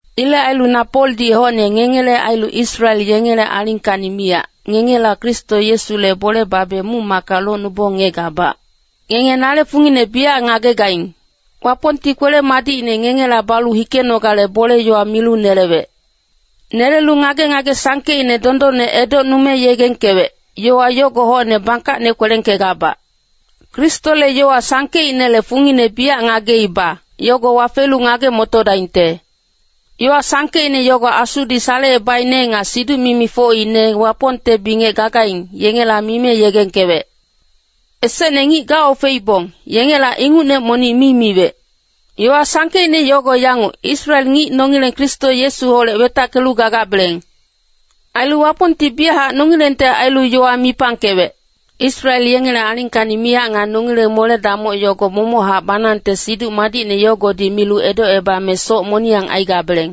Ilec ailu na Poldi hocne ngengele ailu Israel yengele alingkacni miyac, ngengela Kristo Yesule bole babe muc-macka locnubong ngiyegabac. Ngenge nale fungine biyac ngagegaing. Wapongti kwele-madicine ngengela balu hikenogale bole-yowa milu nelewec. Nelelu ngage-ngage sangkeicne dondonne edocnume yegengkewec, yowa yogo hocne bangkacne kwelengkegabac. Kristole yowa sangkeicnele fungine biyac ngageiba, yogo wafelu ngage-motodaingte. Yowa sangkeicne yogo Asudi salecebaicne nga siduc-mimi ngicfocine Wapongte bingec gagaing, yengela mime yegengkewec. Esecne ngic gaofeibong, yengela ingucne monic mi miwec. Yowa sangkeicne yogo yanguc, Israel ngic nongileng Kristo Yesuholec wetackelu gagabeleng. Ailu Wapongti biyachac nongilengte ailu yowa mipangkewec. Israel yengele alingkacni miyac nga nongileng mole-damoc yogo momochac banangte Siduc Madicne yogodi milu edocebame soc moniyang aigabeleng.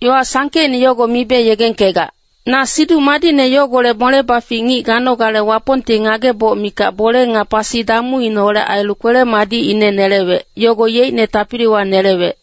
Yowa sangkeicne yogo mibe yegengkegac. Na Siduc Madicne yogolec mole-bafic ngic ganogale Wapongti ngageboc mikac bole nga pasi damuineholec ailu kwele-madicine nelewec, yogo yeicne tapiliwa nelewec.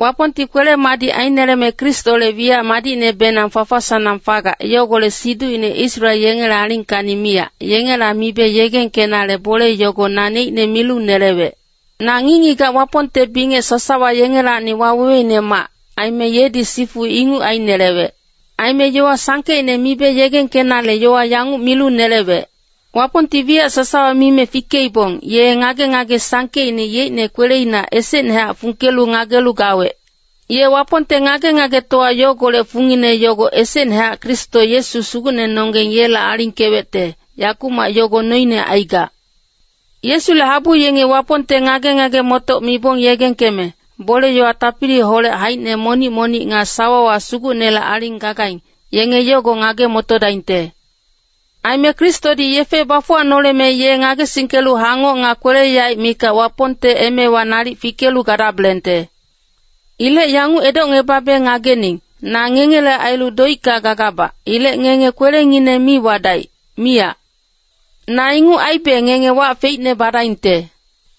Wapongti kwele-madic aineleme Kristole wiyac madicnebenang fafa-sanang fagac, yogolec siducine Israel yengele alingkacni miyac, yengela mibe yegengkenale bole yogo naneicne milu nelewec. Na ngic-ngigac Wapongte bingec sasawa yengelacni waweweinemac, aime yedi sifu inguc ainelewec. Aime yowa sangkeicne mibe yegengkenale yowa yanguc milu nelewec. Wapongti wiyac sasawa mime fikeibong, ye ngage-ngage sangkeicne yeicne kweleina esecnehac fungkelu ngagelu gawec. Ye Wapongte ngage-ngagetowa yogolec fungine yogo esecnehac Kristo Yesu Sugucnenonggeng yela alingkewecte, yakumac yogo noine aigac. Yesule habu yengi Wapongte ngage-ngage-motoc mibong yegengkeme, bole-yowa tapiliholec haicine monic-monic nga sawawa Sugucnele aling gagaing, yenge yogo ngage-motodaingte. Aime Kristodi yefe bafuwanoleme ye ngagesingkelu hangoc nga kwele-yaec mikac Wapongte emewa nalic fikelu gadabelengte. Ilec yanguc edocngebabe ngagening, na ngengele ailu doicka gagabac, ilec ngenge kwelengineng mi wadaic, miyac. Na inguc aibe ngenge wac feicne badaingte.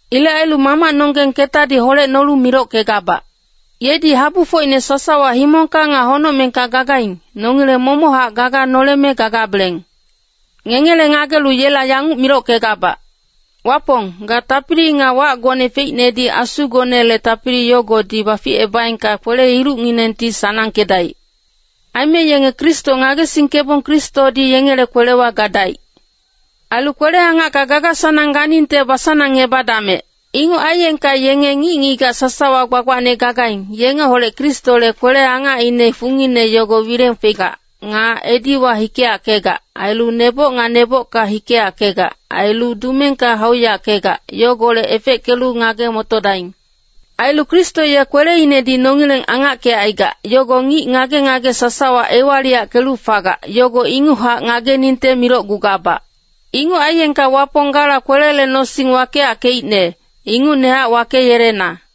Ilec ailu Mamacnonggeng ketadi holecnolu milockegabac. Yedi habufocine sasawa himongka nga honocmengka gagaing, nongileng momochac gaga noleme gagabeleng. Ngengele ngagelu yela yanguc milockegabac, Wapong, ga tapili nga wacgone feicnedi Asugonele tapili yogodi baficebaengka kwele-ilucnginengti sanangkedaic. Aime yenge Kristo ngagesingkebong Kristodi yengele kwelewa gadaic. Ailu kwele-angacka gaga-sanangne ganingte basanangebadamec. Inguc aiyengka yenge ngic-ngigac sasawa gbagbacne gagaing, yengeholec Kristole kwele-angacine fungine yogo wileng fegac, nga ediwa hikeyackegac, ailu neboc nga nebocka hikeyackegac, ailu dumengka hauyackegac, yogolec efeckelu ngage-motodaing. Ailu Kristo ye kweleinedi nongileng angackecaigac, yogo ngic ngage-ngage sasawa ewaliyackelu fagac, yogo inguchac ngageningte milocgugabac. Inguc aiyengka Wapong gala kwelele nosing wakeyackeicne, ingucnehac wakeyelena.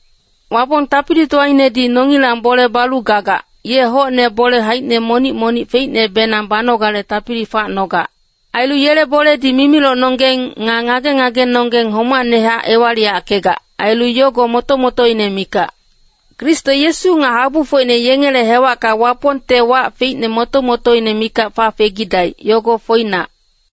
Wapong tapilitowainedi nongilang bole balu gagac, ye hocne bole haicine monic-monic feicnebenang banogale tapili facnogac. Ailu yele boledi mimilocnonggeng, nga ngage-ngagenonggeng homacnehac ewaliyackegac, ailu yogo moto-motoine mikac. Kristo Yesu nga habufocine yengele hewacka Wapongte wac feicne moto-motoine mikac fafegidaic, yogo foinac.